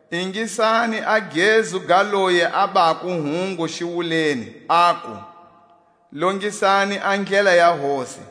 Ingisani a gezu ga loyi a bako hungu xiwuleni, aku: Longisani a ndlela ya Hosi,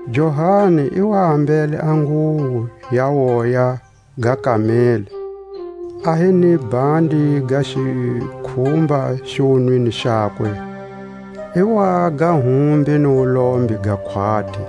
Johani i wa ambele a nguwo ya woya ga kameli, a hi ni bhandi ga xikhumba xiwunwini xakwe; i waga humbi ni wulombe ga khwati.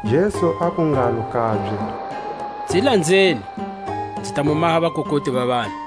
Jesu aku ngalo kabye: Nzi lanzeni, nzi ta mu maha vakukuti va vanhu.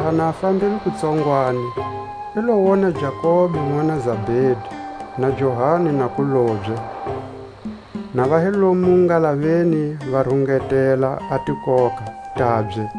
Laha na fambile kutsongwani, i lo wona Jakobe nʼwana Zabedi, na Johani nakulobye, na va hi lomu ngalaveni va rungetela a tikoka tabye.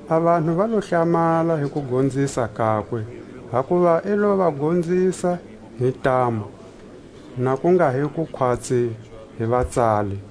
A vanhu va lo hlamala hi kugonzisa kakwe, hakuva i lo va gonzisa hi ntamu, na ku nga hi ku khwatsi hi vatsali.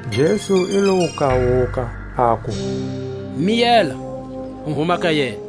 Jesu i lo wu kawuka, aku: Miyela, u huma ka yena.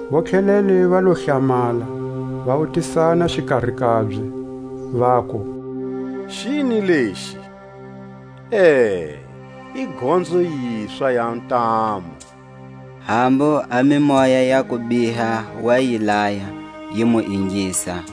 Vontlhelele va lo hlamala, va wutisana xikari kabye, vaku: Xini lexi? E, i gonzo yiswa ya ntamu! Hambu a mimoya ya kubiha wa yi laya, yi mu ingisa.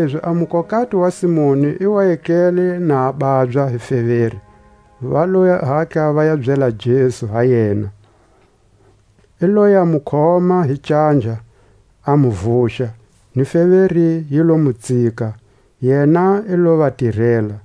Kanilezi a mukokati wa Simoni i wa etlele na a babya hi feveri, va lo hatla va byela Jesu ha yena. I loya mu khoma hi canja, a mu vuxa, ni feveri yi lo mu tsika; yena i lo va tirela.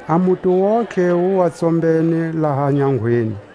A muti wontihe wu wa tsombene laha nyangweni.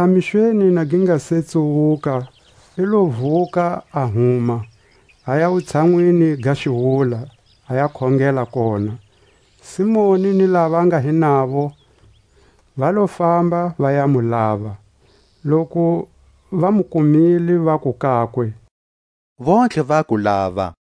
Laha mixweni na gi nga se tsuwuka i lo vuka a huma, aya wutshanwini ga xiwula, a ya khongela kona. Simoni ni lava va nga hi navo va lo famba va ya mu lava. Loku Va mu kumile vaku kakwe: Vontlhe va ku lava.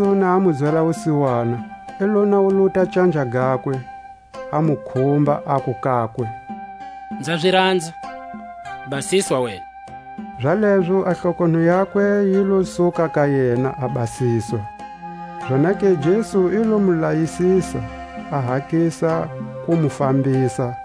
Jesu na a mu zwela wusiwana, i lo nawuluta canja gakwe, a mu khumba, aku kakwe: Nza zi ranza, basiswa wena. Zalezo a hlokonho yakwe yi lo suka ka yena, a basiswa. Zonake Jesu i lo mu layisisa, a hatlisa ku mu fambisa,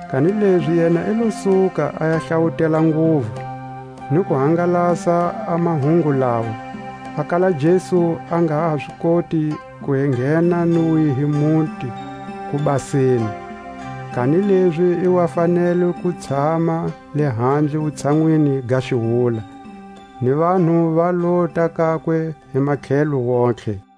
Kanilezi yena i lo suka a ya hlawutela nguvu, ni ku hangalasa a mahungu lawa, a kala Jesu a nga ha zi koti ku enghena ni wihi muti kubaseni; kanilezi i wa fanele ku tshama lehandle wutshanwini ga xiwula, ni vanhu va lota kakwe hi matlhelo wontihe.